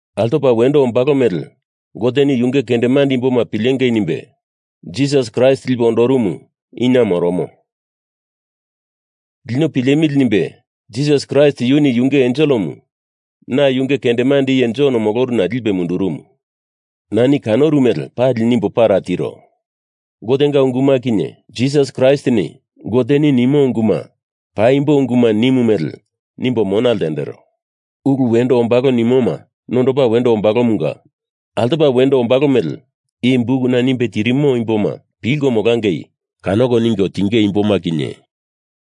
Altopa wendo ombalo mele Goteni Yunge kendemande imboma pilengei nimbe Jisas Kraist lipe ondorumumu inie moromo. Lino pilemili nimbe Jisas Kraist yuni yunge enselemu na yunge kendemande iye Jon moloruna lipe mundurumu. Nani kanoru mele pali nimbo para tiro. Gotenga unguma kinye Jisas Kraistini Goteni nimo unguma paimbo unguma nimu mele nimbo mona ltendero. Ulu wendo ombalo nimoma nondopa wendo ombalomunga altopa wendo ombalo mele i bukuna nimbe tirimo imboma pilko molangei kanoko ningo tinge imboma kinye,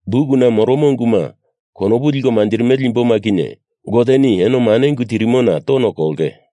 bukuna moromo unguma konopu liko manjirimele imboma kinye Goteni eno mane ungu tirimona tono kolonge.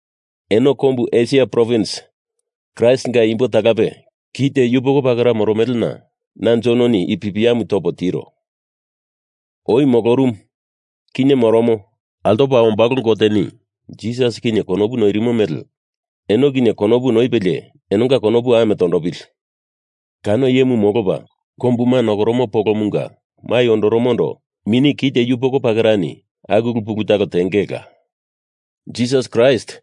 Eno kombu Esia provins Kraistinga imbo talape kite yupoko pakera moromelena na Jononi i pipiamu topo tiro. Oi molorumu, kinye moromo, altopa ombalo Goteni Jisas kinye konopu noirimo mele eno kinye konopu noipelie enonga konopu ame tondopili! Kano iyemu molopa kombuma nokoromo polomunga mai ondoromondo mini kite yupoko pakerani aku ulu pulu talo tengeila! Jisas Kraist,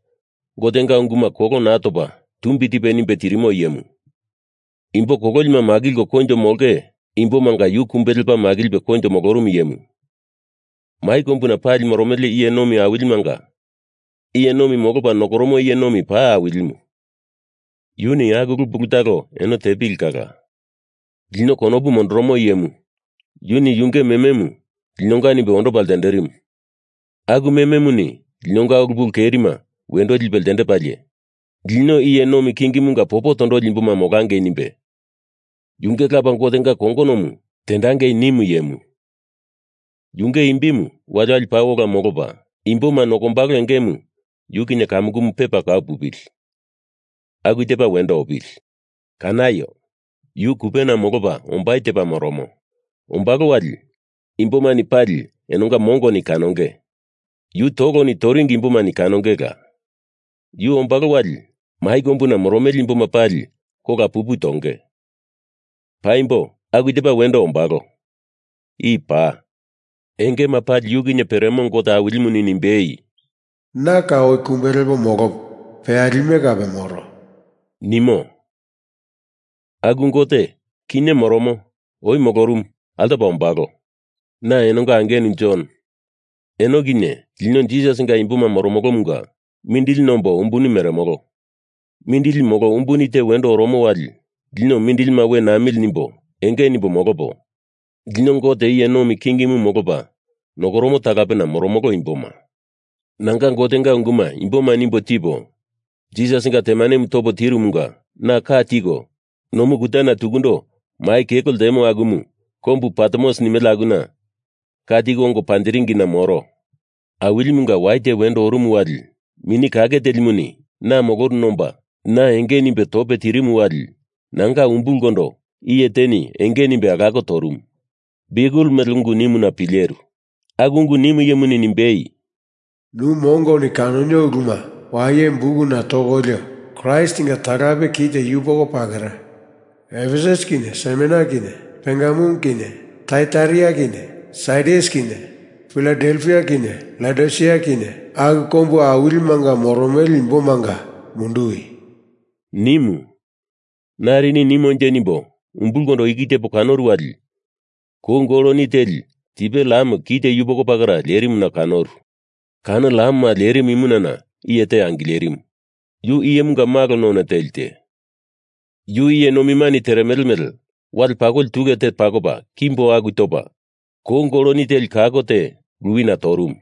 Gotenga unguma kolo naa topa tumbi tipe nimbe tirimo iyemu, imbo kololima makilko koinjo molonge imbomanga yu kumbe lepa makilipe koinjo molorumu iyemu, mai kombuna pali moromele iye nomi awilimanga iye nomimu molopa nokoromo iye nomi paa Awilimu, yuni aku ulu pulu talo eno tepili kala. Lino konopu mondoromo iyemu, yuni yunge mememu linonga nimbe ondopa ltenderimu aku mememuni linonga ulu pulu kerima wendo lipe ltendepalie, lino iye nomi kingimunga popo tondoli imboma molangei nimbe Yunge Lapa Gotenga kongonomu tendangei nimu iyemu, yunge imbimu wali wali paa ola molopa, imboma nokombalo engemu yu kinye kamukumu pepa kau pupili! Aku tepa wendo opili! Kanaio! Yu kupena molopa ombai tepa moromo. Ombalo wali imbomani pali enonga mongoni kanonge. Yu toloni toringi imbomani kanongela. Yu ombalo wali mai kombuna moromele imboma pali kola pupu tonge. Paimbo aku tepa wendo ombalo. I paa. Engema pali yu kinye peremo Gote Awilimuni nimbei, “Na kau oi kumbe lepo molopo peyalime kape moro,” nimo. Aku Gote kinye moromo, oi molorumu, altopa ombalo. Na enonga angenu Jon, eno kinye lino Jisasinga imboma moromolomunga mindili nombo umbuni meremolo. Mindili molo umbuni te wendo oromo wali lino mindilima we namili nimbo enge nimbo molopo, lino Gote iye nomi kingimu molopa nokoromo talapena moromolo imboma. Na Gotenga unguma imboma nimbo tipo, Jisasinga temanemu topo tirumunga na ka tiko nomu kutana tukundo mai kelo ltemo akumu kombu Patmos nimele akuna ka tiko ongo panjiringina moro. Awilimunga wai te wendo orumu wali Mini Kake Telimuni na moloruna omba na enge nimbe tope tirimu wali nanga umbulkondo iye teni enge nimbe alako torumu, biukel mele ungu nimuna, pileru. Aku ungu nimu iyemuni nimbei, “Nu mongoni kanonio uluma waye bukuna tokolio Kraistinga talape kite yupoko pakera, Efesus kinye Smerna kinye Pergamum kinye Taiataira kinye Sardis kinye Filadelfia kinye Laodisia kinye, aku kombu awilimanga moromele imbomanga munduwi!” nimu. Narini nimonje nimbo umbulkondo iki tepo kanoru wali kou goloni teli tipe lam kite yupoko pakera lerimuna kanoru. Kano lamema lerimu imunana iye te angilerimu, yu Iyemunga Malo none teli te, yu iye nomimani teremele mele wale pakoli tule te pakopa kimbo aku topa, kou goloni teli kako te luwina torumu.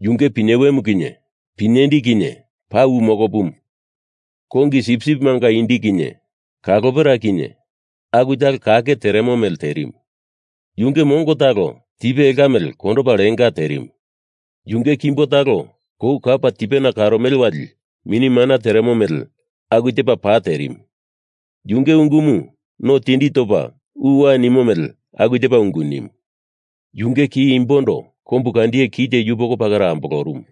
Yunge pinyewemu kinye pinyendi kinye paa u mokopumu, kongi sipsipimanga indi kinye kalopera kinye aku talo kake teremo mele terimu. Yunge mongo talo tipe elka mele kondopa lenga terimu. Yunge kimbo talo kou kapa tipena karomele wali mini mana teremo mele aku tepa pa terimu. Yunge ungumu no tindi topa uwa nimo mele aku tepa ungu nimu. Yunge ki imbondo kombu kandiye kite yupoko pakera ambolorumu.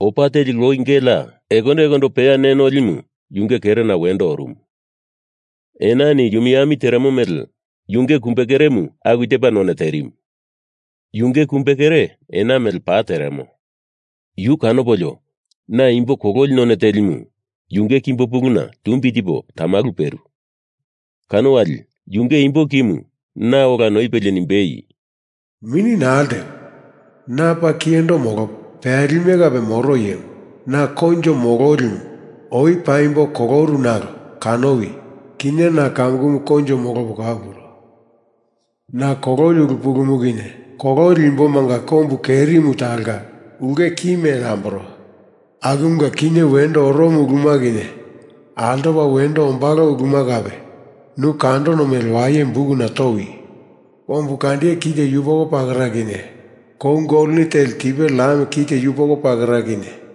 Opa teli loi gelea ekondo ekondo peya ne nolimu yunge kerena wendo orumu. Enani yumi ami teremo mele yunge kumbe keremu aku tepa none terimu. Yunge kumbekere ena mele pa teremo. Yu kanopolio na imbo kololi none telimu yunge kimbo puluna tumbi tipo tamalu peru. Kano wali yunge imbo kimu na ola noipelie nimbei, “Mini naa ltewi! Na paa Kiyendo molopo peyalime kape moro iyemu. Na Koinjo Mololimu. Oi paimbo koloru nalo kanowi, kinye na kamukumu koinjo molopo kau puro. Na kololi ulu pulumu kinye kololi imbomanga kombu kerimu talonga ulke ki mele amboro. Akumunga kinye wendo oromo uluma kinye altopa wendo ombalo uluma kape nu kandono mele waye bukuna towi! Kombu kandiye kite yupoko pakera kinye kou goloni teli tipe lam kite yupoko pakera kinye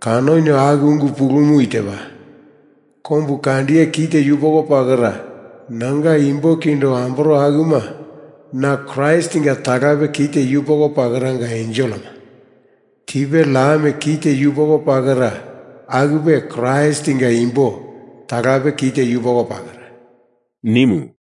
kanonio aku ungu pulumu itepa: kombu kandiye kite yupoko pakera nanga imbo kindo amboro akuma na Kraistinga talape kite yupoko pakeranga enselema, tipe lam kite yupoko pakera akupe Kraistinga imbo talape kite yupoko pakera,” nimu.